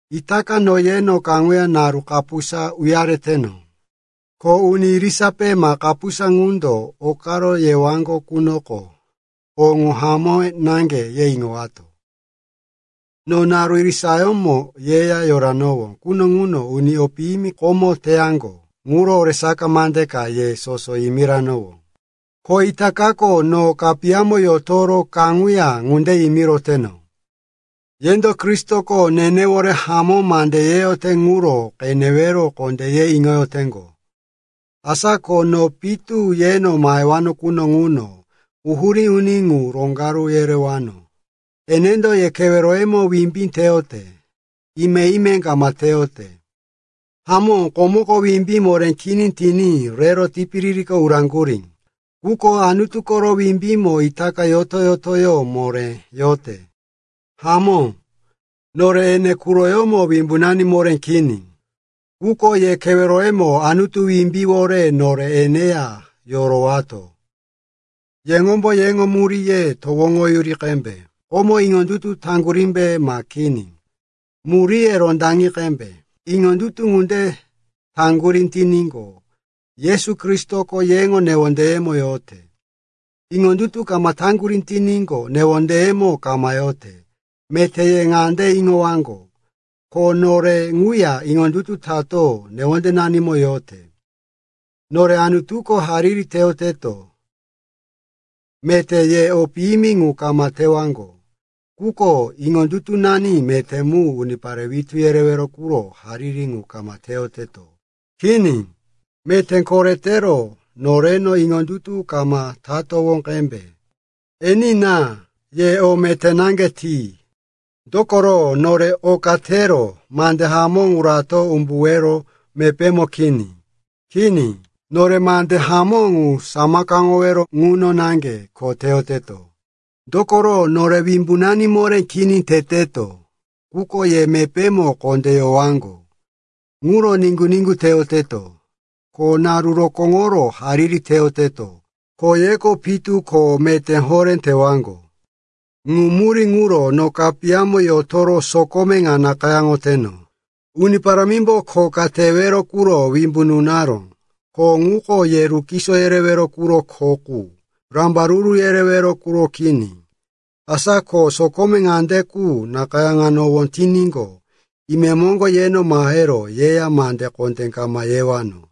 Itaka no yeno kaŋuya naru kapusa uyareteno. “Ko uni irisape ma kapusa ŋundo okaro yewaŋgo qunoko o ŋu hamó naŋge ye iŋowato.” No naru irisayómo yeya yoranowó quno ŋuno uni o piyimi komo teyaŋgo ŋuro oresaka mande ka ye soso yimiranowó. Ko itakako no kapiyamo yotoro kaŋuya ŋunde yimiroteno. Yendo Kristoko nenewore hamó mande yeyote ŋuro qenewero kondé ye iŋoyoteŋgo. Asa ko no pitu yeno mahewano quno ŋuno quhurí uni ŋu roŋgaru yerewano. Enendo ye keweroyemo wimbí teyote, ime-ime kama teyote. Hamó, komoko wimbí moré kini tiní rero tipiririko uraŋgurí. Quko Anutu koro wimbímo itaka yoto-yotoyó moré yote. Hamó, nore ene quroyómo wimbunani moré kini. Quko ye keweroyemo Anutu wimbíwore nore eneya yorowato. Yeŋombo yeŋo muríye towoŋoyuri qembe, komo iŋondutu taŋgurímbe, ma kini? Muríye rondaŋi qembe. Iŋondutu ŋunde taŋgurí tiníqo, Yesu Kristoko yeŋo newondeyemo yote. Iŋondutu kama taŋgurí tiníqo, newondeyemo kama yote. Meté ye ŋande iŋowaŋgo, ko nore ŋuya iŋondutu tato newondenanimo yote. Nore Anutuko hariri teyoteto, meté ye o piyimi ŋu kama tewaŋgo. Quko iŋondutunani meté mu unipare witú yerewero quro hariri ŋu kama teyoteto. Kini. Meté koretero noreno iŋondutu kama tatowó qembe. Enina, ye o meté naŋge ti. Dokoro nore oka tero mande hamó ŋu rato umbuwero mepémo kini. Kini, nore mande hamó ŋu samakaŋowero ŋuno naŋge kho teyoteto. Dokoro nore wimbunani moré kini teteto, quko ye mepémo kondé yowaŋgo, ŋuro niŋgu-niŋgu teyoteto. Ko naru rokóŋoro hariri teyoteto, ko yeko pitu ko meté horé tewaŋgo. Ŋu murí ŋuro no kapiyamo yotoro sokome ŋa nakayáŋoteno. Uni Parámimbo kho ka tewero quro wimbu nunaró. Kho ŋuko ye rukiso yerewero quro kho qu, rambaruru yerewero quro kini. Asa ko sokome ŋande qu nakayáŋowano tiníqo, imemoŋgo yeno mahero yeya mande kondé kama yewano.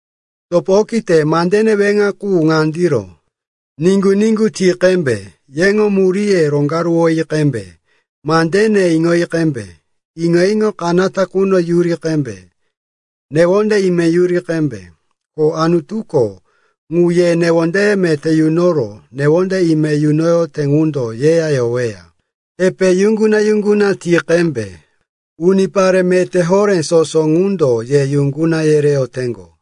Topo okite, mandene weŋa qu ŋandiro. Niŋgu-niŋgu ti qembe, yeŋo muríye roŋgaruwi qembe, mandene iŋoyi qembe, iŋo-iŋo kanata quno yuri qembe, newonde ime yuri qembe. Ko Anutuko, ŋu ye newonde meté yunoro newonde ime yunoyote ŋundo yeya yoweya. Epe yuŋguna-yuŋguna ti qembe. Unipare meté horé soso ŋundo ye yuŋguna yereyoteŋgo.